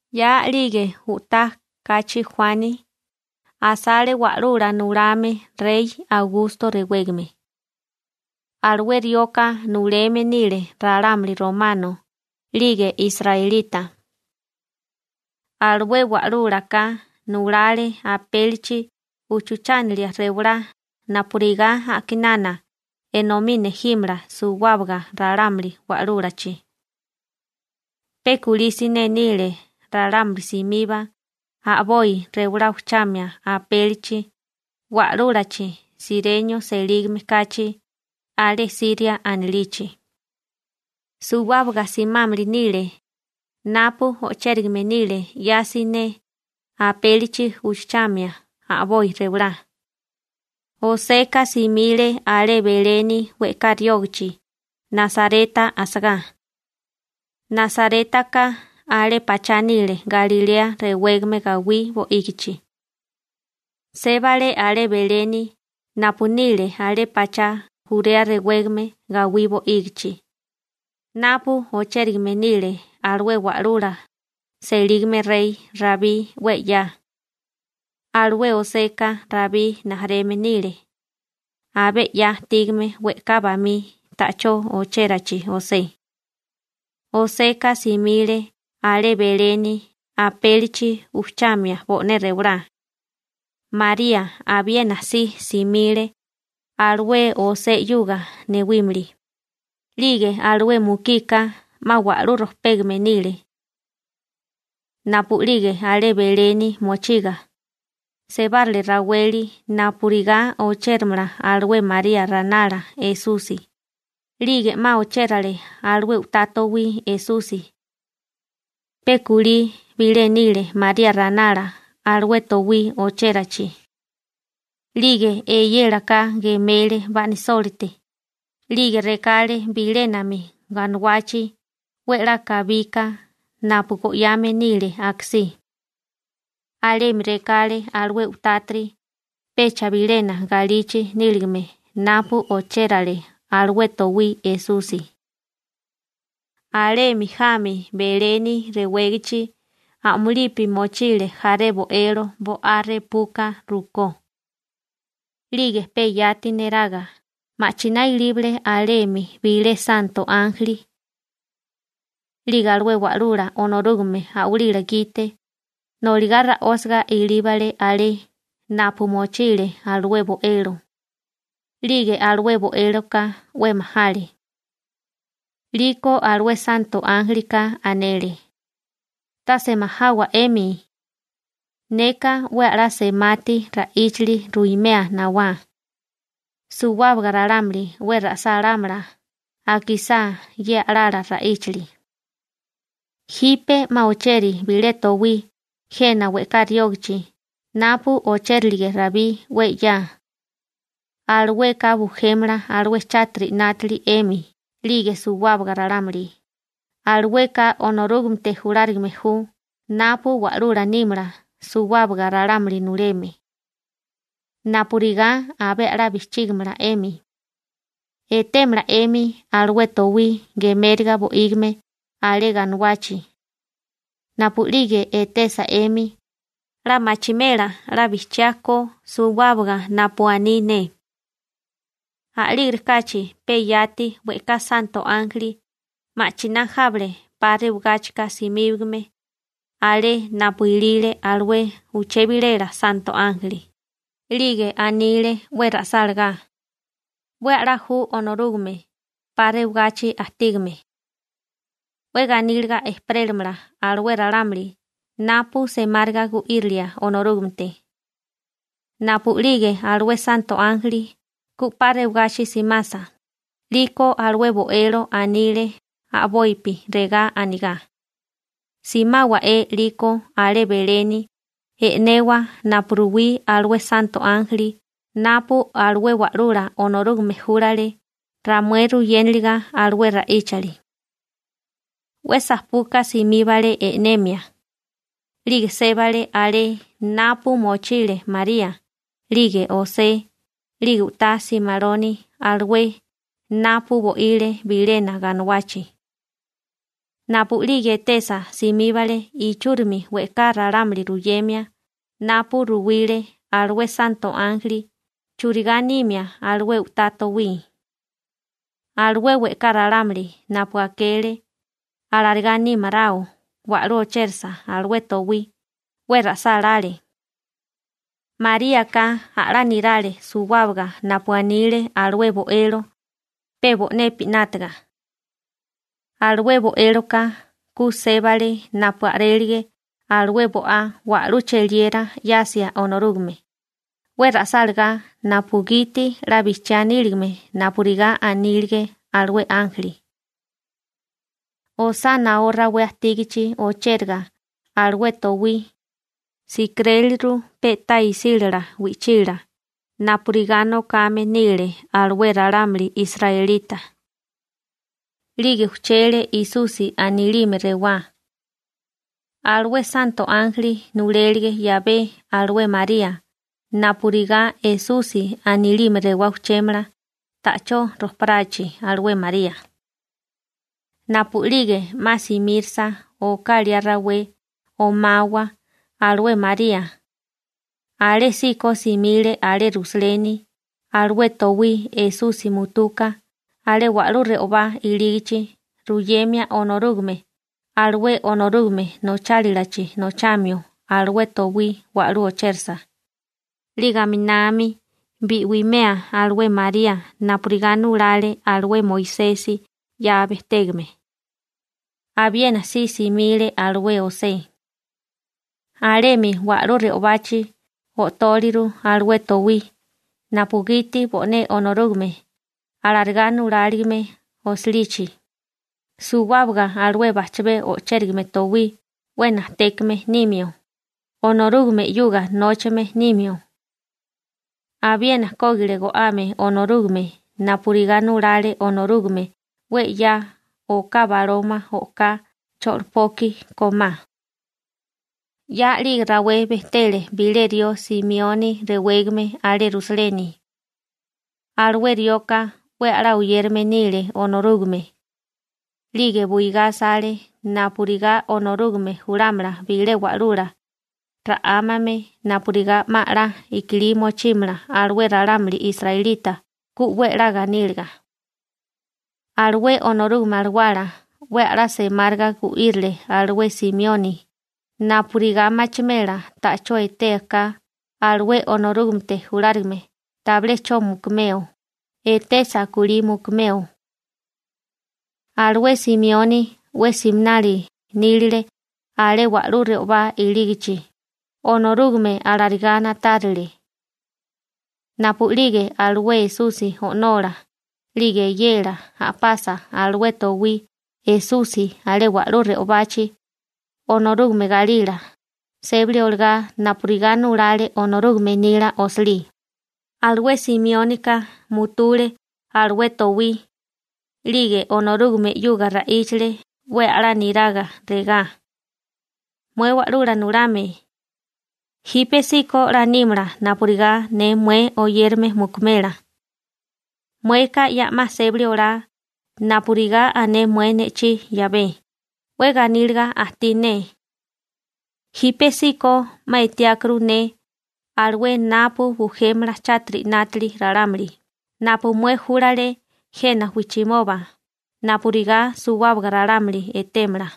'Ya a'lige u'tá kachi Juani, asale wa'lula nulame rey Augusto rewégame. Alué rioka nuleme nile ralámuli romano 'lige israelita. Alué wa'lúlaka nulale apélichi uchuchánilia rewalá napurigá a'kinana enomí nejímala suwábaga ralámuli wa'lúlachi. Pe kulí siné nile ralámuli simiba a'boi rewalá uchuchamia apélichi wa'lúlachi Sirenio selígame kachi alé Siria anilichi. Suwábaga simámili nile napu o'chérigame nile 'ya siné apélichi uchuchamia a'boi rewalá. Joseka simile alé Beleni we'ká riógachi Nasareta asagá. Nasarétaka alé pachá nile Galilea rewégame gawí bo'ígichi. Sébale alé Beleni napu nile alé pachá Jurea rewégame gawí bo'ígichi, napu ochérigame nile alué wa'lula selígame rey Rabí 'we 'ya, alué Joseka Rabí rijimala nile, abé 'ya ajtígame we'ká bamí ta'chó ochérachi José. Joseka simile alé Beleni apélichi ujchamia bo'né rewalá. María abiena si simile, alué José 'yuga newímili, 'lige alué mukika 'ma wa'lú rojpégame nile. Napu'lige alé Beleni mochiga, sebárale raweli napurigá ochéramala alué María ranala Esusi, 'lige 'ma ochérale alué u'tá towí Esusi. Pe kulí bilé nile María ranala alué towí ochérachi. 'Lige eyélaka gemele ba'nisólite, 'lige rekale bilénami ganuwachi 'we 'la kabika napu go'yame nile akasí. Alemi rekale alué u'tátiri pecha bilena galichi níligame napu ochérale alué towí Esusi. Alemi jami Beleni rewégachi a'mulipi mochile jaré bo'elo bo'á repuka rukó. 'Lige pe yati neraga ma'chiná ilíbale alemi bilé santo ánjeli. 'Lige alué Wa'lula Onorúgame a'walila gite noligá ra'ósiga ilíbale alé napu mochile alué bo'elo. 'Lige alué bo'éloka 'we majale. 'Liko alué santo ánjelika anele: ―Tase majawa 'emi. Neka 'we a'lá semati ra'íchali ruimea nawá. Suwábaga ralámuli 'we ra'sálámala akisá ye a'lala ra'íchali. Jipe 'ma ocheri bilé towí jena we'ká riógachi napu ochérilige Rabí 'we 'ya. Alueka bujémala alué chátiri 'nátali 'emi 'lige suwábaga ralámuli, alueka Onorúgamete julárigame ju napu wa'lula nímala suwábaga ralámuli nuleme. Napurigá abé a'lá bijchígimala 'emi, etémala 'emi alué towí gemériga bo'ígime alé ganuwachi. Napu'lige etesa 'emi, 'la machimela 'la bijchiá ko suwábaga napu aní ne. A'lígerikáchi pe yati we'ká santo ánjeli ma'chiná jábale 'pa rewagáchika simíbagame alé napu ilile alué uché bilela santo ánjeli, 'lige anile 'we ra'sálagá: ¡'We a'lá ju Onorúgame 'pa rewagachi ajtígame! ¡'We ganíliga ejperélamala alué ralámuli napu semáriga gu'írilia Onorúgamete! Napu'lige alué santo ánjeli ku 'pa rewagachi simasa, 'liko alué bo'elo anile a'bopi regá anigá: ―Simáwa'é 'liko alé Beleni e'newa napu ruwí alué santo ánjeli napu alué Wa'lula Onorúgame júlale ramué ruyénaliga alué ra'íchali. 'We sajpuka simíbale e'nemia, 'lige sébale alé napu mochile María, 'lige José, 'lige u'tá simaloni alué napu bo'ile bilena ganuwachi. Napu'lige etesa, simíbale ichúrimi we'ká ralámuli ruyemia napu ruwile alué santo ánjeli churigá nimia alué u'tá towí. Alué we'ká ralámuli napu akele alarigá nímaráo wa'lú ochérasa alué towí, 'we ra'sálále. Maríaka a'lá nirale suwábaga napu anile alué bo'elo, pe bo'nepi 'nátaga. Alué bo'éloka ku sébale napu a'rélige alué bo'á wa'lú cheliera 'yasia Onorúgame, 'we ra'sálagá napugiti 'la bijchiá níligame napurigá anílige alué ánjeli. Osá naó rawé ajtígachi ochéraga alué towí, sikiréliru pe'tá isílala wi'chila napurigá nokame nile alué ralámuli israelita. 'Lige ujchele Esusi anilime rewá. Alué santo ánjeli nulélige 'yabé alué María napurigá Esusi anilime rewá ujchémala ta'chó rojparachi alué María. Napu'lige 'ma simírisa oká liá rawé omawa alué María, alésíko simile alé Rusaleni alué towí Esusi mutuka alé wa'lú re'obá ilígichi ruyemia Onorúgame alué Onorúgame nochálilachi nochamio alué towí wa'lú ochérasa, 'lige aminami bi'wimea alué María napurigá nulale alué Moisesi 'ya bejtégame. Abiena si simile alué José. Alemi wa'lú re'obachi o'tóleru alué towí napugiti bo'né Onorúgame alarigá nuláligime osilichi, suwábaga alué bajchabé o'chérigame towí 'we najtékame nimio, Onorúgame 'yuga nóchame nimio. Abiena kógile go'ame Onorúgame napurigá nulale Onorúgame 'we 'ya oká baloma oká cho'lopoki kómá. 'Ya a'lige rawé bejtele bilé rió Simioni rewégame alé Rusaleni. Alué rioka 'we a'lá oyérame nile Onorúgame, 'lige buigá asale napurigá Onorúgame julámala bilé wa'lula, ra'ámame, napurigá 'ma 'la i'kilí mochímala alué ralámuli israelita ku 'we 'la ganíliga. Alué Onorúgame Alawala 'we a'lá semáriga gu'írile alué Simioni napurigá machimela ta'chó etea ka alué Onorúgamete julárigame tabilé 'cho mukumeo, etesa kulí mukumeo. Alué Simioni 'we siminali nílile alé wa'lú re'obá ilígachi, Onorúgame alarigá na'tárile. Napu'lige alué Esusi o'nola 'lige eyela a'pasa alué towí Esusi alé wa'lú re'obachi Onorúgame galila sébali olagá napurigá nulale Onorúgame nila osilí, alué Simiónika mutule alué towí, 'lige Onorúgame 'yuga ra'íchale 'we a'lá niraga, regá: Mué Wa'lula Nulame, jípesíko 'la nímala napurigá ne mué oyérame mukimela, mueka ya 'ma sébali olá napurigá ané mué ne'chí 'yabé, 'we ganíliga ajtí ne. Jípesíko 'ma etiákuru ne alué napu bujémala chátiri 'nátili ralámuli napu mué júlale jena wijchimoba napurigá suwábaga ralámuli etémala.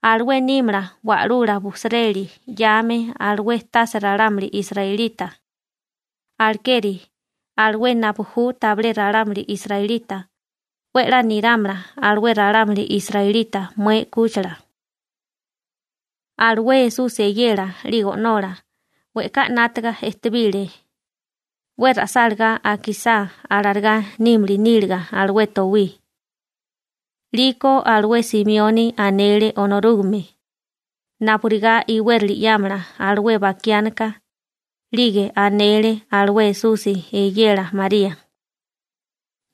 Alué nímala Wa'lula bujsireli 'yame alué tase ralámuli israelita, alekeri alué napu ju tabilé ralámuli israelita 'we 'la nirámala alué ralámuli israelita mué 'kúchila. Alué Esusi eyela 'lige o'nola we'ká 'nátaga ejtebile 'we ra'sálagá akisá alarigá nímili níliga alué towí. 'Liko alué Simioni anele Onorúgame napurigá iwérili 'yámala alué bakiánika, 'lige anele alué Esusi eyela María: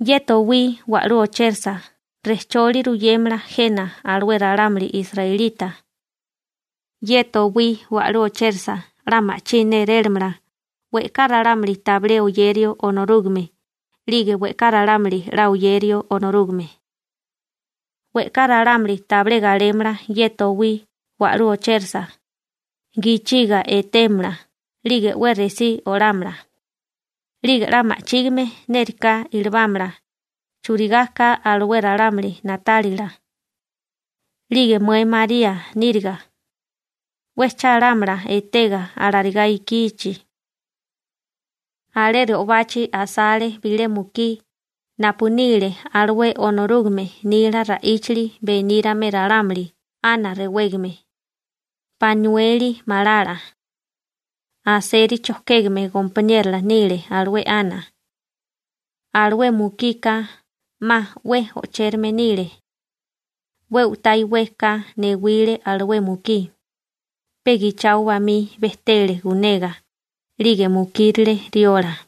―Ye towí wa'lú ochérasa rejcholi ruyémala jena alué ralámuli israelita. Ye towí wa'lú ochérasa 'la ma'chí nérélamala we'ká ralámuli tabilé oyerio Onorúgame 'lige we'ká ralámuli 'la oyerio Onorúgame. We'ká ralámuli tabilé galémala ye towí wa'lú ochérasa, gichiga etémala 'lige 'we resí olámala, 'lige 'la ma'chígime nériká ilibámala churigá ka alué ralámuli na'tálila. 'Lige mué María níriga, 'we chálámala etega alarigá ikichi. Alé re'obachi asale bilé mukí napu nile alué Onorúgame nila ra'íchali benírame ralámuli Ana rewégame, Panueli malala. Aseri chojkégame gompaniérola nile alué Ana. Alué mukika 'ma 'we o'chérame nile. 'We u'tá iwé ka newile alué mukí, pe gichao bamí bejtele gunega 'lige mukírile riola.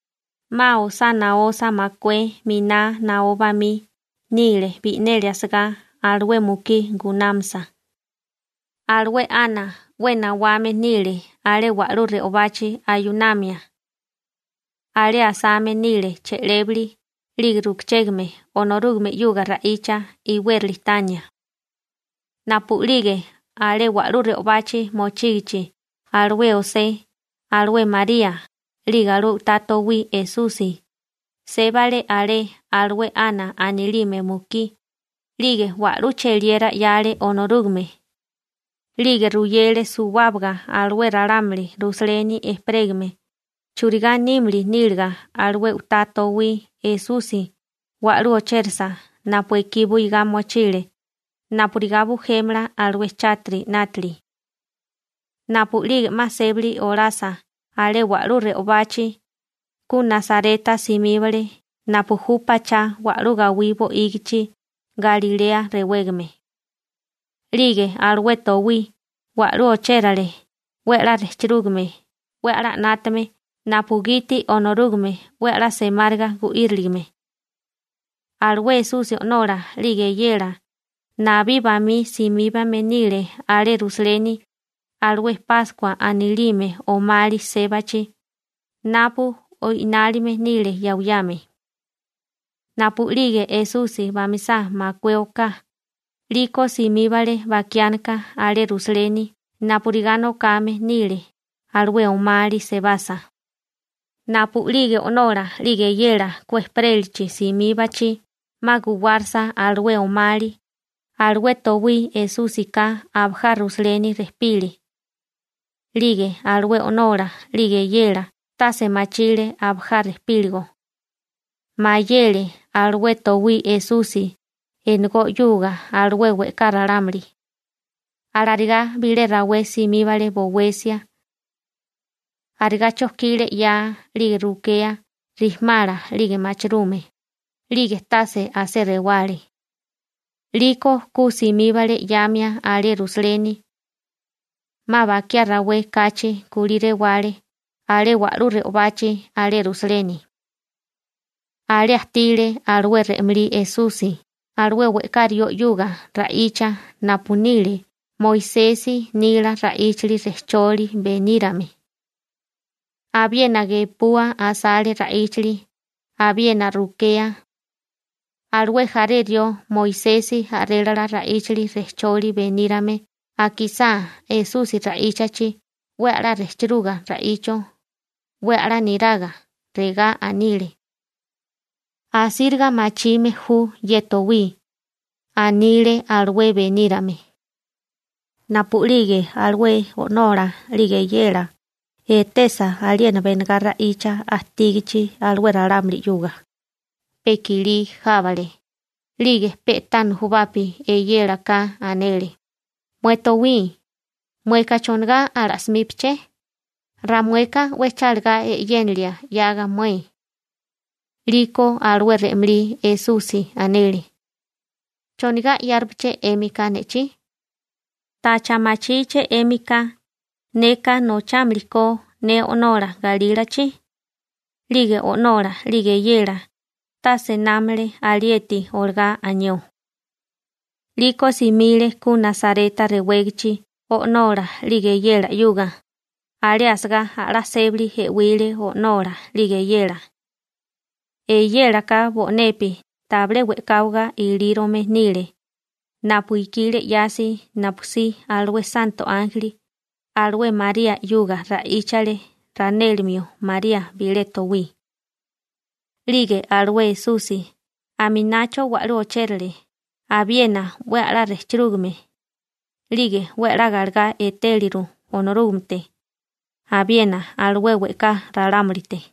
'Ma osánósa makué miná naó bamí nile bi'neli asagá alué mukí gunámasa. Alué Ana 'we nawame nile alé wa'lú re'obachi ayunamia. Alé asame nile che'lébali 'lige rukachégame Onorúgame 'yuga ra'icha iwérali tania. Napu'lige alé wa'lú re'obachi mochígichi alué José, alué María, 'lige alué u'tá towí Esusi, sébale alé alué Ana anilime mukí, 'lige wa'lú cheliera 'yale Onorúgame, 'lige ruyele suwábaga alué ralámuli Rusaleni ejperégame churigá nímili níliga alué u'tá towí Esusi wa'lú ochérisa napu ekí buigá mochile napurigá bujémala alué chátiri 'nátili. Napu'lige 'ma sébali olasa alé wa'lú re'obachi, ku Nasareta simíbale napu ju pachá wa'lú gawí bo'ígichi Galilea rewégame. 'Lige alué towí wa'lú ochérale 'we a'lá rejchirúgame 'we a'lá 'nátame napugiti Onorúgame 'we a'lá semáriga gu'íriligime. Alué Esusi o'nola 'lige eyela nabí bamí simíbame nile alé Rusaleni alué Páskua anilime omali sébachi napu o'inálime nile yawiyame. Napu'lige Esusi bamisá makué oká, 'liko simíbale bakiánika alé Rusaleni napurigá nokame nile alué omali sebasa. Napu'lige o'nola 'lige eyela ku ejperélachi simíbachi 'ma guwárasa alué omali, alué towí Esúsika abajá Rusaleni rejpile. 'Lige alué o'nola 'lige eyela tase machile abajá rejpíligo. Mayele alué towí Esusi enegó 'yuga alué we'ká ralámuli. Alarigá bilé rawé simíbale bowesia. Arigá chojkile 'yaa 'lige rukea rijimala 'lige machirume, 'lige tase asé rewale. 'Liko ku simíbale 'yáamia alé Rusaleni. 'Ma bakiá rawé kachi kulí rewale alé wa'lú re'obachi alé Rusaleni. Alé ajtile alué re'malí Esusi alué we'ká rió 'yuga ra'icha napu nile Moisesi nila ra'íchali rejchólila benírame. Abiena gepua asale ra'íchali abiena rukea. Alué jaré rió Moisesi a'rélala ra'íchali rejcholi benírame akisá Esusi ra'íchachi 'we a'lá rejchiruga ra'icho, 'we a'lá niraga, regá anile: «Asíriga machime ju ye towí», anile alué benírame. Napu'lige alué o'nola 'lige eyela etesa aliena benegá ra'icha ajtígichi alué ralámuli 'yuga, pe i'kilí jábale, 'lige pe'tá nujubapi eyélaka anele: ―Mué towí, ¿mueka chonigá ala'simípiché? Ramueka 'we chálagá e'yénilie 'yaga mué. 'Liko alué re'malí Esusi anele: ―¿Chonigá 'yárupaché 'émika ne'chí? ¿Tacha machíché 'émika neka nochámali ko ne O'nola galílachi? 'Lige o'nola 'lige eyela tase námale alieti olagá anió. 'Liko simile ku Nasareta rewégachi o'nola 'lige eyela 'yuga, alé asagá a'lá sébali e'wile o'nola 'lige eyela. Eyélaka bo'nepi tabilé we'káwaga ilírome nile napu ikile 'yasi napusí alué santo ánjeli alué María 'yuga ra'íchale ranélimio María bilé towí. 'Lige alué Esusi aminacho wa'lú ochérale abiena 'we a'lá rejchirúgame, 'lige 'we a'lá galegá etéliru Onorúgamete, abiena alué we'ká ralámulite.